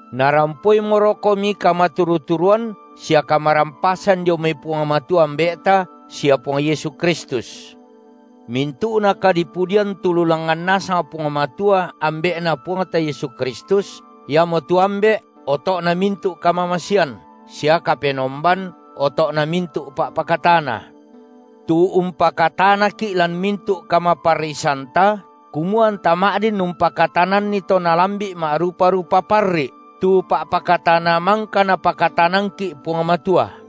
Narampoimorokomi kamaturu-turuan sia kamarampasan dio mai Puang Matua Ambe’ta sia Puang Yesu Kristus. Mintu’na kadipudian tu langngan nasang Puang Matua, Ambe’Na Puangta Yesu Kristus, Iamotu Ambe’ oto’na mintu’ kamamasean, sia Kapenomban oto’na mintu’ pa’pakatana, tu umpakatanaki’ lan mintu’ kamaparrisanta, kumua anta ma’din umpakatananni to nalambi’ ma’rupa-rupa parri’ tu pa’pakatana mangka Napakatanangki’ Puang Matua.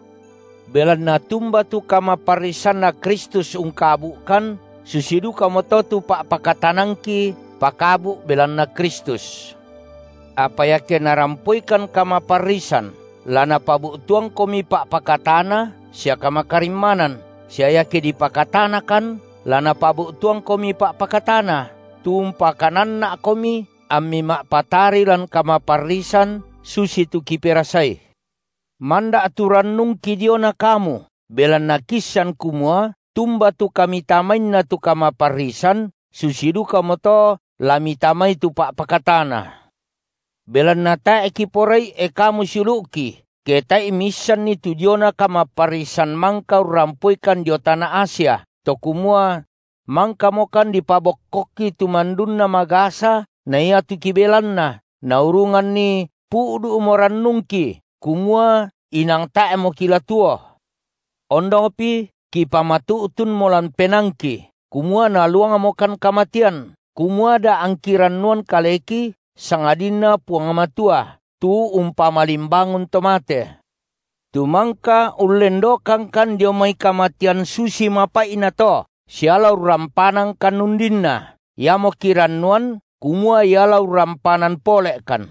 Belanna tumba tu kamaparrisanNa Kristus ungkabu’kan, susi dukamoto tu pa’pakatanangki pakabu’ belanna Kristus. Apa iake narampoikan kamaparrisan, la napabu’tuangkomi pa’pakatana sia kamakarimmanan, sia iake dipakatanakan, la napabu’tuangkomi pa’pakatana, tu umpakananna’komi ammi ma’patari lan kamaparrisan susitu kiperasai. Manda’ tu rannungki diona kamu, belanna kiissan kumua tumba tu kamitamainna tu kamaparrisan, susi dukamoto la mitamai tu pa’pakatana. Belanna tae’ kiporai, e kamu siulu’ki, ke tae’i miissanni tu diona kamaparrisan mangka urrampoikan dio tana Asia, to kumua: mangkamokan dipabokkokki tu mandunna magasa na iatu kibelanna, naurunganni pu’du’mo rannungki kumua inang tae’mo kila tuo. Ondongpi kipamatu’tunmo lan penaangki, kumua naluangmokan kamatean, kumua da angki rannuan kaleki, sangadinna Puang Matua, tu umpamalimbangun to mate; tu mangka ullendokangkan dio mai kamatean susi mapai’na to, sia la urrampanangkan undinna. Iamo kirannuan kumua Ia la urrampanan pole’kan,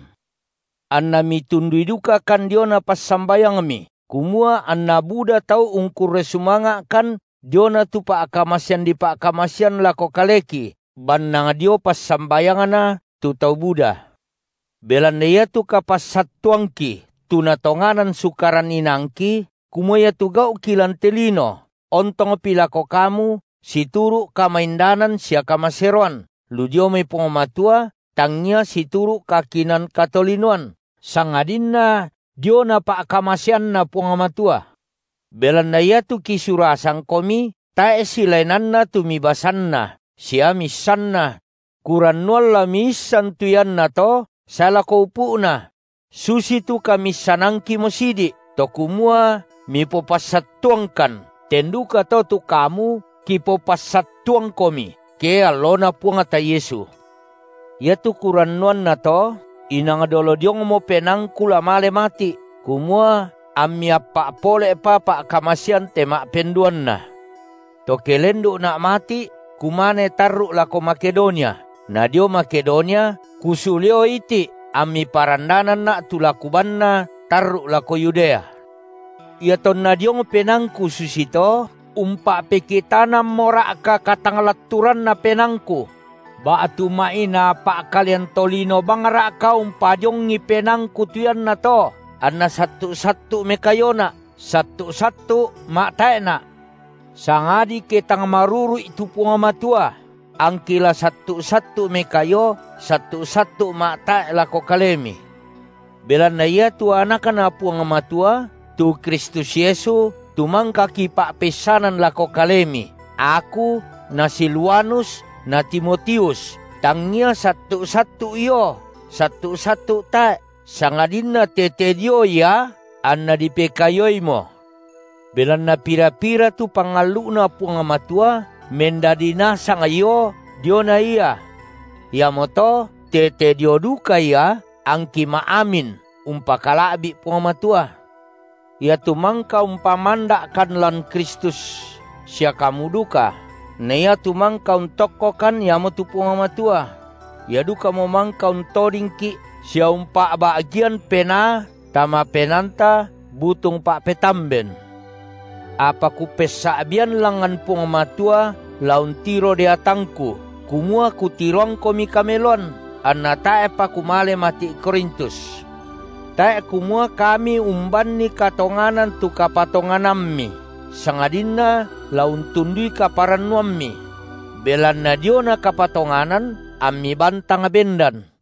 anna mitundui dukakan diona passambayangmi, kumua anna buda tau ungkurre sumanga’kan diona tu pa’kamasean dipa’kamasen lako kaleki bannang dio passambayangna tu tau buda. Belanna iatu kapassattuangki, tu natonganan sukaran inaangki, kumua iatu gau’ki lan te lino, ontongpi lako kamu situru’ kamaindanan sia kamaseroan, lu dio mai Puang Matua, tangngia situru’ kakinaan katolinoan, sangadinna diona pa’kamaseanNa Puang Matua. Belanna iatu kisurasangkomi tae’ silaenanna tu mibasanna sia miissanna; kurannuan la miissan tu iannato sae lako upu’na; susitu kamiissanangkimo sidi’, to kumua mipopassattuangkan, ten dukato tu kamu kipopassattuangkomi, ke alloNa Puangta Yesu. Iatu kurannuannato, inang dolo diongmo penaangku la male mati’, kumua ammi appa’ pole’pa pa’kamasean te ma’penduanna. To ke lendu’na’ mati’ kumane tarru’ lako Makedonia, nadio Makedonia kusuleo iti’, ammi parandananna’ tu la kubaanna tarru’ lako Yudea. Iatonna diong penaangku susito, umpa’pekitanammora’ka katanglatturanna penaangku? Ba’tu ma’inaa pa’kalean tolino bangra’ka umpadiongi penaangku tu iannato, anna sattu’-sattu’ mekaiona’, sattu’-sattu’ ma’tae’na’? Sangadi ke tang maruru’I tu Puang Matua, angki la sattu’-sattu’ mekaio, sattu’-sattu’ ma’tae’ lako kalemi! Belanna iatu AnakNa Puang Matua, tu Kristus Yesu, tu mangka kipa’peissanan lako kalemi, aku na Silwanus na Timotius, tangngia sattu’-sattu’ io, sattu’-sattu’ tae’, sangadinna tete dio Ia anna dipekaioimo. Belanna pira-pira tu pangallu’Na Puang Matua, mendadi nasang io diona Ia. Iamoto tete dio duka Ia angki ma’amin umpakala’bi’ Puang Matua. Ia tu mangka umpamanda’kan lan Kristus sia kamu duka na iatu mangka untokkokan, Iamotu Puang Matua; Ia dukamo mangka untodingki’ sia umpa’ba’gian Penaa tama penaanta butung pa’petamben. Apa kupessa’bian langngan Puang Matua la untiro deatangku, kumua kutiroangkomi kameloan, anna tae’pa kumale mati’ Korintus. Tae’ kumua kami umbanni katonganan tu kapatonganammi, sangadinna la untundui kaparannuammi; belanna diona kapatonganan ammi bantang bendan.